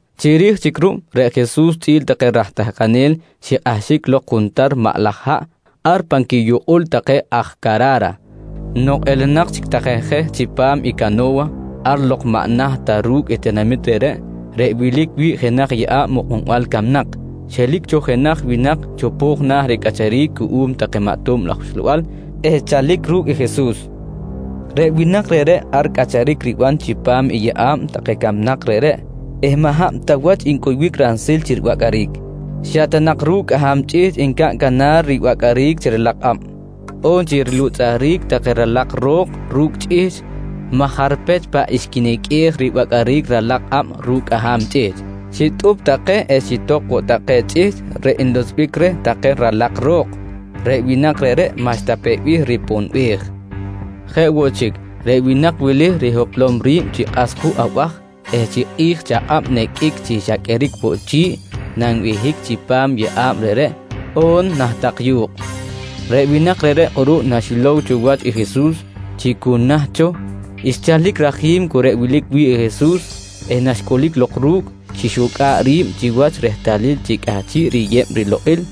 Chiri̱j chic reꞌ Jesus chꞌi̱l take raj tahkanel xikꞌahxic lok juntar maꞌ laj haꞌ ar pan quiyukꞌul take aj Cara̱ra. Nok elenak chic take je chipam i cano̱wa, ar lok maꞌ naht ta ru̱cꞌ i tinamit reꞌreꞌ, reꞌ wilic wi̱ꞌ jenaj yeꞌa̱b mukꞌunbal camnak, xelic cho jenaj winak chopo̱j na̱ ricꞌacharic cuꞌum take maꞌ tob laj uxlabal eh xchalic ru̱cꞌ i Jesus. Reꞌ winak reꞌreꞌ ar cꞌacharic riban chipam i yeꞌa̱b take camnak reꞌreꞌ eh maꞌ hab ta wach ncuybic ransil chi ribacꞌaric. Xa ta nak ru̱cꞌ cꞌaham chꞌihchꞌ ncaꞌn canar ribacꞌaric chi ralak kꞌab on chi rilutzꞌuric take ralak ro̱k ru̱cꞌ chꞌihchꞌ maj jarpech paꞌ xquiniqꞌuej ribacꞌaric ralak kꞌab ru̱cꞌ cꞌaham chꞌihchꞌ, xitꞌup take eh xitok woꞌ take chꞌihchꞌ reꞌ nlutzꞌbic reh take ralak ro̱k. Reꞌ winak reꞌreꞌ maꞌxta peꞌ bih riponbej! Jeꞌ woꞌ chic, reꞌ winak wili rihoplom ri̱b chi kꞌas juꞌ abaj eh chi kꞌi̱j chi akꞌab niqꞌuic chi xa qꞌueric woꞌ chi̱ꞌ nanbehic chipam i yeꞌa̱b reꞌreꞌ on nah tak yu̱kꞌ. Reꞌ winak reꞌreꞌ kꞌuruꞌ naxilow cho wach i Jesus chi cu naht cho, xchalic rajim cu reꞌ wilic wi̱ꞌ i Jesus eh naxcꞌulic lok ru̱cꞌ, xixucꞌa̱ꞌ ri̱b chiwach rehtalil chi cꞌahchiꞌ riyeb rilokꞌil.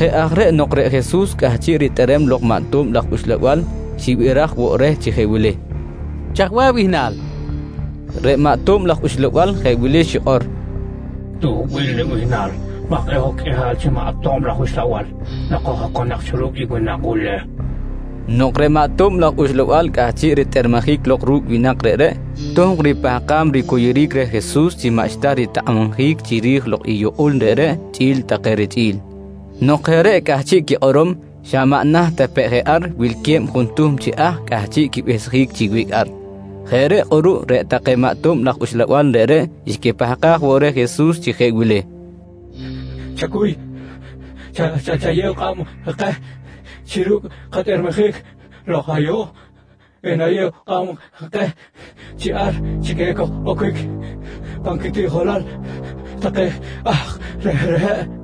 Jeꞌ aj reꞌ nok reꞌ Jesus cꞌahchiꞌ ritꞌerem lok i maꞌ tob laj uxlabal, xibiraj woꞌ reh chi jeꞌ wili: «Chaj bih abihnal? nqui reh. Reꞌ maꞌ tob laj uxlabal jeꞌ wili xikꞌor: «Tuhbil nibihnal maj kꞌe̱ꞌ hoj qꞌuihal chi maꞌ tob laj uxlabal nok hoj oconak cho ru̱cꞌ i winak wili, nqui reh. Nok reꞌ maꞌ tob laj uxlabal cꞌahchiꞌ ritꞌermejic lok ru̱cꞌ winak reꞌreꞌ, tohkꞌ ripahkam ricuyuric reh Jesus chi maꞌxta ritakꞌabjic chiri̱j lok i yukꞌul reꞌreꞌ chꞌi̱l take richꞌi̱l. Nok jeꞌ reꞌ cꞌahchiꞌ quikꞌorom, xa maꞌ naht ta peꞌ je ar wilque̱b juntuhm chi ahk cꞌahchiꞌ quibehsjic chi wiꞌc ar. Jeꞌ reꞌ kꞌuruꞌ reꞌ take maꞌ tob laj uxlabal reꞌreꞌ xquipahkaj woꞌ reh Jesus chi jeꞌ wili: «Chacuy chayew kꞌab keh chi ru̱cꞌ katꞌermejic lok ayuꞌ, enayew kꞌab keh chi ar chic ekoj-oquic pan quitiꞌjolal take ahk reꞌreꞌ, nqui take reh.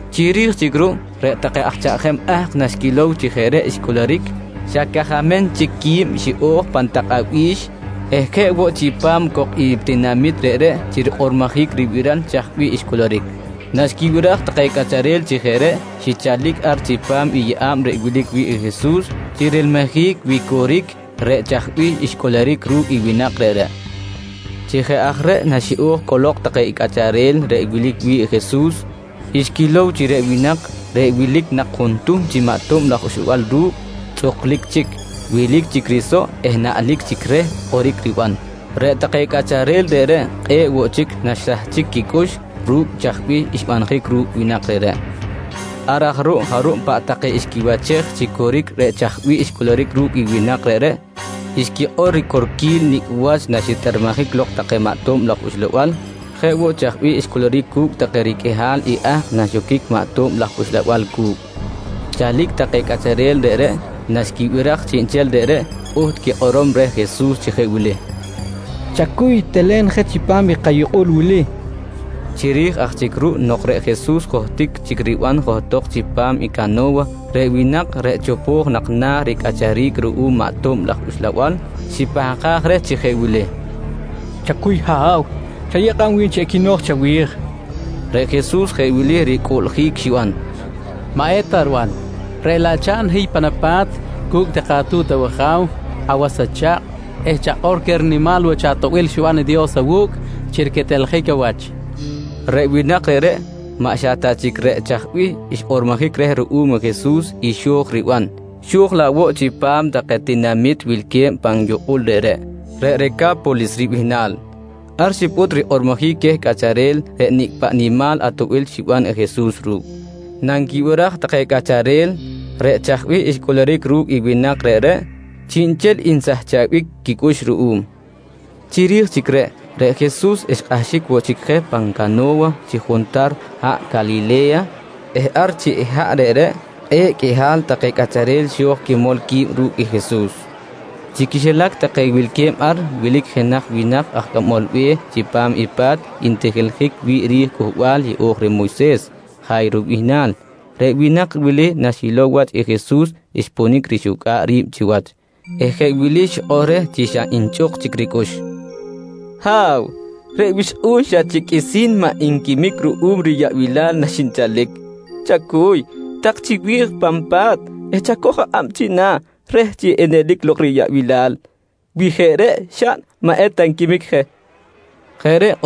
Chiri̱j chic ruꞌ, reꞌ take aj chaꞌjem ahk naxquilow chi jeꞌ reꞌ xcꞌuluric, xa cajamem chic qui̱b xiꞌo̱j pan tak abi̱x eh jeꞌ woꞌ chipam cok i tinamit reꞌreꞌ chi rikꞌormojic ribiral chaj bih xcꞌuluric. Naxquibiraj take cꞌacharel chi jeꞌ reꞌ, xichalic ar chipam i yeꞌa̱b reꞌ wilic wi̱ꞌ i Jesus chi rilmijic wi coric reꞌ chaj bih xcꞌuluric ru̱cꞌ i winak reꞌreꞌ. Chi jeꞌ aj reꞌ naxiꞌo̱j cꞌolok take i cꞌacharel reꞌ wilic wi̱ꞌ Jesus, xquilow chi reꞌ winak reꞌ wilic nak juntuhm chi maꞌ tob laj uxlabal ru̱cꞌ, tzꞌuklic chic, wilic chic risoꞌ eh naꞌlic chic reh kꞌoric riban. Reꞌ take cꞌacharel reꞌreꞌ kꞌe̱ꞌ woꞌ chic naxsahchic quicꞌux ru̱cꞌ chaj bih xbanjic ru̱cꞌ winak reꞌreꞌ. Ar aj ruꞌ jarub paꞌ take xquiwachej chi coric reꞌ chaj bih xcꞌuluric ru̱cꞌ i winak reꞌreꞌ, xquikꞌor ricorquil nicꞌ wach naxitꞌermejic lok take i maꞌ tob laj uxlabal, jeꞌ woꞌ chaj bih xcꞌuluric cu̱cꞌ take riqꞌuihal i ahk naxoquic take maꞌ tob laj uxlabal cu̱cꞌ. Chalic take cꞌacharel reꞌreꞌ naxquibiraj chiꞌnchel reꞌreꞌ, pꞌuht quikꞌorom reh Jesus chi jeꞌ wili: «Chacuy telen je chipam i kayukꞌul wili, nqui take reh. Chiri̱j aj chic ruꞌ nok reꞌ Jesus johtic chic riban johtok chipam i cano̱wa, reꞌ winak reꞌ chopo̱j nak na̱ ricꞌacharic ruꞌum maꞌ tob laj uxlabal, xipahkaj reh chi jeꞌ wili: «Chacuy ha̱w, chayew kꞌab wi̱n chi equino̱j chawi̱j, nqui reh. Reꞌ Jesus jeꞌ wili ricꞌuꞌljic xiban: «Maꞌeta riban, reꞌ laꞌ chaꞌn hiy pan apa̱t cu̱cꞌ take atu̱t awaja̱w, awas acha̱kꞌ eh chakꞌor queh i rinimal wach atoꞌbil xiban i Dios awu̱cꞌ chi riqueteljic awach, nqui reh. Reꞌ winak reꞌreꞌ maꞌ xa ta chic reꞌ chaj bih xkꞌormojic reh ruꞌum Jesus i xo̱j riban, xo̱j laꞌ woꞌ chipam take tinamit wilque̱b pan yukꞌul reꞌreꞌ, reꞌ Reca̱polis ribihnal. Ar xipꞌut rikꞌormojic queh cꞌacharel reꞌ nicꞌ paꞌ nimal atoꞌbil xiban i Jesus ru̱cꞌ. Nanquibiraj take cꞌacharel reꞌ chaj bih xcꞌuluric ru̱cꞌ i winak reꞌreꞌ, chiꞌnchel nsahchabic quicꞌux ruꞌum. Chiri̱j chic reꞌ, reꞌ Jesus xkꞌahxic woꞌ chic je pan cano̱wa chi juntar haꞌ Calile̱ya eh ar chi̱ꞌ i haꞌ reꞌreꞌ, kꞌe̱ꞌ qꞌuihal take cꞌacharel xo̱j quimol qui̱b ru̱cꞌ i Jesus. Chi quixilac take wilque̱b ar, wilic jenaj winak aj cꞌamol be̱h chipam i pa̱t ntijiljic wi̱ꞌ ri̱j i Cꞌuhbal Yeꞌo̱j reh Moyses, Ja̱yro ribihnal. Reꞌ winak wili naxilow wach i Jesus xponic rixucꞌa̱ꞌ ri̱b chiwach eh jeꞌ wili xikꞌor reh chi xa nchꞌuk chic ricꞌux: «Ha̱w, reꞌ wixkꞌu̱n xa chic qꞌuisi̱n maꞌ nquimic ruꞌum riyaꞌbilal naxinchalic. Chacuy, tak chiwi̱j pan pa̱t eh chacoj akꞌab china̱ reh chi enelic lok riyaꞌbilal. Wi jeꞌ reꞌ xaꞌn maꞌ eta nquimic je, nqui reh.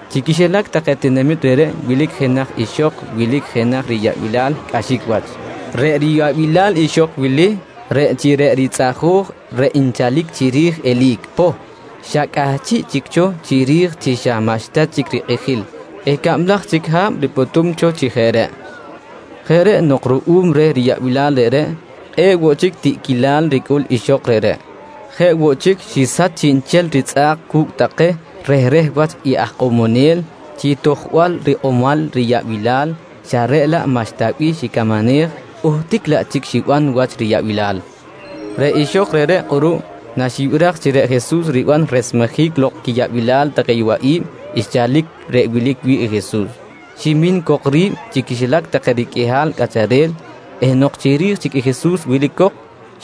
Chi quixilac take tinamit reꞌreꞌ wilic jenaj ixok wilic jenaj riyaꞌbilal cꞌaxic wach. Reꞌ riyaꞌbilal ixok wili reꞌ chi reꞌ ritzꞌajo̱j reꞌ nchalic chiri̱j eli̱c poh, xa cꞌahchiꞌ chic cho chiri̱j chi xa maꞌxta chic rikꞌijil eh cablaj chic ha̱b ripꞌutum cho chi jeꞌ reꞌ. Jeꞌ reꞌ nok ruꞌum reh riyaꞌbilal reꞌreꞌ, kꞌe̱ꞌ woꞌ chic tiꞌquilal ricꞌul ixok reꞌreꞌ. Jeꞌ woꞌ chic, xisach chiꞌnchel ritzꞌa̱k cu̱cꞌ take rehreh wach aj ikꞌomonel chi tojbal rikꞌomal nak riyaꞌbilal xa reꞌ laꞌ maꞌxta bih xicamanej, uhtic laꞌ chic xiban wach riyaꞌbilal. Reꞌ ixok reꞌreꞌ kꞌuruꞌ, naxibiraj chi reꞌ Jesus riban resmejic lok quiyaꞌbilal take yowaꞌi̱b, xchalic reꞌ wilic wi̱ꞌ i Jesus, ximin cok ri̱b chi quixilac take riqꞌuihal cꞌacharel eh nok chiri̱j chic i Jesus wilic cok,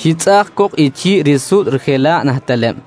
xitzꞌaꞌj cok i chi̱ꞌ risuꞌt rijela̱ꞌ nah teleb.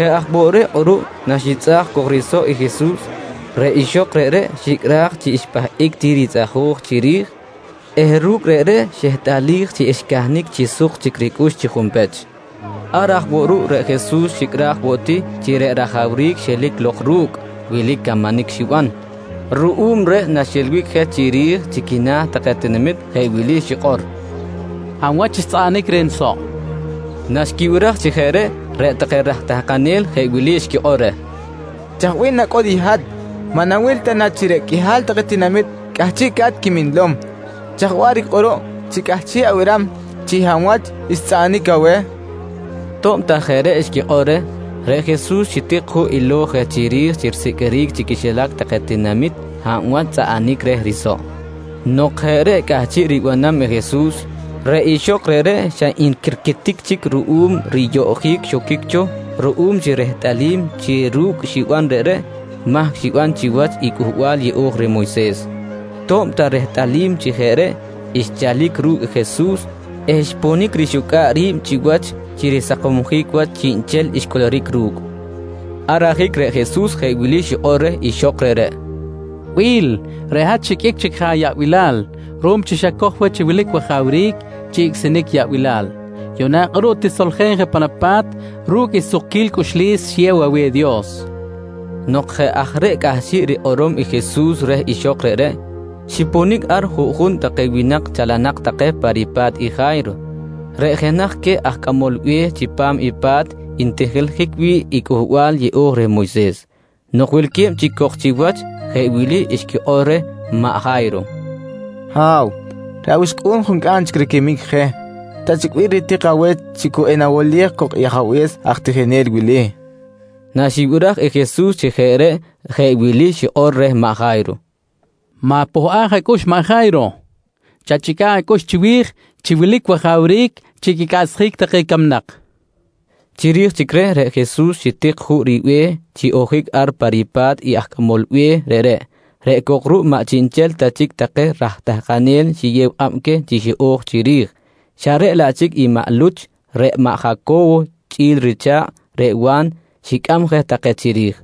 Jeꞌ aj woꞌ reꞌ kꞌuruꞌ naxitzꞌaꞌj cok risoꞌ i Jesus, reꞌ ixok reꞌreꞌ xicꞌraj chi xpahꞌic ti ritzꞌajo̱j chiri̱j eh ru̱cꞌ reꞌreꞌ xehtꞌalij chi xcahnic chi suk chic ricꞌux chi junpech. Ar aj woꞌ ruꞌ, reꞌ Jesus xicꞌraj woꞌ ti chi reꞌ rajawric xelic lok ru̱cꞌ wilic camanic xiban, ruꞌum reꞌ naxilbic je chiri̱j chi quina̱ take tinamit jeꞌ wili xikꞌor: «Hab wach xtzꞌaꞌanic reh nisoꞌ? nqui queh. Naxquibiraj chi jeꞌ reꞌ, reꞌ take raj tahkanel xquikꞌor reh: «Chaj bih nacꞌul i hat? Maꞌ nawil ta na chi reꞌ qꞌuihal take tinamit cꞌahchiꞌca̱t quiminlom. Chaj waꞌric kꞌuruꞌ chi cꞌahchiꞌ abiram chi hab wach xtzꞌaꞌanic aweh? nqui take reh. To̱b ta jeꞌ reꞌ xquikꞌor reh, reꞌ Jesus xitik juꞌ ilo̱j je chiri̱j chi risiqꞌuiric chi quixilac take tinamit hab wach xtzꞌaꞌanic reh i risoꞌ. Nok jeꞌ reꞌ cꞌahchiꞌ ribanam i Jesus, reꞌ ixok reꞌreꞌ xa nquirquitic chic ruꞌum riyoꞌjic xoquic cho ruꞌum chi rehtꞌalim chi ru̱cꞌ xiban reꞌreꞌ, mahc xiban chiwach i Cꞌuhbal Yeꞌo̱j reh Moyses. To̱b ta rehtꞌalim chi jeꞌ reꞌ, xchalic ru̱cꞌ Jesus eh xponic rixucꞌa̱ꞌ ri̱b chiwach chi risakomsjic wach chiꞌnchel xcꞌuluric ru̱cꞌ. Ar ajic reꞌ Jesus jeꞌ wili xikꞌor reh ixok reꞌreꞌ: «Bi̱l, reꞌ hat xiqꞌuic je ayaꞌbilal ruꞌum chi xacoj wach chi wilic wajawric chi icꞌsinic yaꞌbilal. Yuꞌna kꞌuruꞌ, tisoljen je pan apa̱t ru̱cꞌ i sukquil cꞌuxlis xiyew aweh i Dios, nqui reh. Nok jeꞌ aj reꞌ cꞌahchiꞌ rikꞌorom i Jesus reh ixok reꞌreꞌ, xiponic ar juꞌjun take winak chalanak take pa ripa̱t i Ja̱yro reꞌ jenaj queh aj cꞌamol be̱h chipam i pa̱t ntijiljic wi̱ꞌ i Cꞌuhbal Yeꞌo̱j reh Moyses. Nok wilque̱b chic cok chiwach, jeꞌ wili xquikꞌor reh maꞌ Ja̱yro: «Ha̱w, reꞌ awixkꞌu̱n juncꞌam chic riquimic je. Ta chic bih ritik aweh chi cu enawolej cok i ajabe̱s aj tijinel wili, nqui take reh. Naxibiraj i Jesus chi jeꞌ reꞌ, jeꞌ wili xikꞌor reh maꞌ Ja̱yro: «Ma̱pohꞌaj acꞌux maꞌ Ja̱yro. Chachꞌica̱ꞌ acꞌux chiwi̱j chi wilic wajawric chi quicꞌaꞌchsjic take camnak, nqui reh. Chiri̱j chic reꞌ, reꞌ Jesus xitik juꞌ ribe̱h chi ojic ar pa ripa̱t i aj cꞌamol be̱h reꞌreꞌ, reꞌ cok ruꞌ maꞌ chiꞌnchel ta chic take raj tahkanel xiyew kꞌab queh chi xiꞌo̱j chiri̱j xa reꞌ laꞌ chic i maꞌ Luch, reꞌ maꞌ Jaco̱wo chꞌi̱l richa̱kꞌ reꞌ Wa̱n, xicꞌam je take chiri̱j.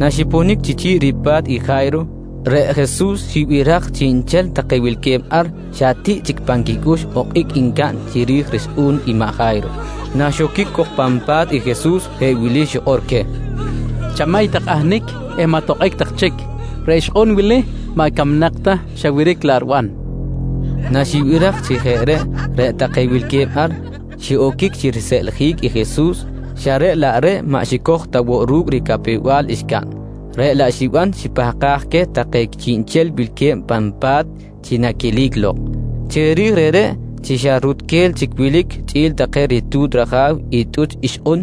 Naxiponic chi chi̱ꞌ ripa̱t i Ja̱yro, reꞌ Jesus xibiraj chi chiꞌnchel take wilque̱b ar xa tiꞌ chic pan quicꞌux okꞌic ncaꞌn chiri̱j rixkꞌu̱n i maꞌ Ja̱yro. Naxoquic cok pan pa̱t i Jesus jeꞌ wili xikꞌor queh: «Chamay tak ahnic eh maꞌ tokꞌic tak chic. Reꞌ ixkꞌun wili maꞌ camnak ta, xa wiric laꞌ riban, nqui queh. Naxquibiraj chi jeꞌ reꞌ take wilque̱b ar xiꞌoquic chi riseꞌljic i Jesus xa reꞌ laꞌ reꞌ xa maꞌ xicoj ta woꞌ ru̱cꞌ ricapew-bal xcaꞌn, reꞌ laꞌ xiban xipahkaj queh take chiꞌnchel wilque̱b pan pa̱t chi naquelic lok. Chiri̱j reꞌreꞌ, chi xa rutquel chic wilic chꞌi̱l take ritu̱t raja̱w i tꞌuch ixkꞌun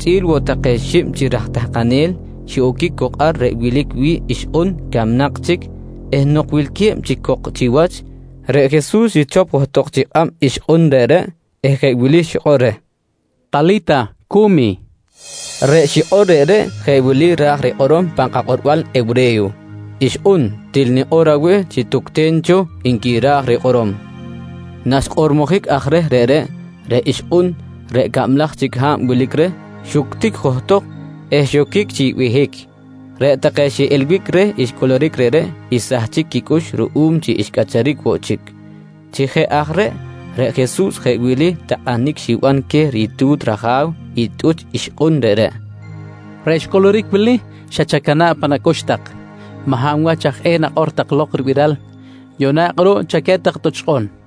chꞌi̱l woꞌ take xib chi raj tahkanel, xiꞌoquic cok ar reꞌ wilic wi̱ꞌ ixkꞌun camnak chic eh nok wilque̱b chic cok chiwach, reꞌ Jesus xichop johtok chi kꞌab ixkꞌun reꞌreꞌ eh jeꞌ wili xikꞌor reh: «Tali̱ta, cu̱mi, nqui reh. Reꞌ xikꞌor reꞌreꞌ, jeꞌ wili ra̱j rikꞌorom pan kakꞌorbal hewre̱yo: “Ixkꞌun, til nikꞌor aweh chi tucten cho, nqui ra̱j rikꞌorom. Naxkꞌormojic aj reh reꞌreꞌ, reꞌ ixkꞌun reꞌ cablaj chic ha̱b wilic reh, xuctic johtok eh xoquic chi behic. Reꞌ take xiꞌilbic reh xcꞌuluric reꞌreꞌ xsahchic quicꞌux ruꞌum chi xcꞌacharic woꞌ chic. Chi jeꞌ aj reꞌ, reꞌ Jesus jeꞌ wili takꞌanic xiban queh i ritu̱t raja̱w i tꞌuch ixkꞌun reꞌreꞌ: «Reꞌ xcꞌuluric wili xa chacana̱ꞌ pan acꞌux tak, maꞌ hab wach aj eh nakꞌor tak lok ribiral. Yuꞌna kꞌuruꞌ chaquet tak i tꞌuch ixkꞌun, nqui queh.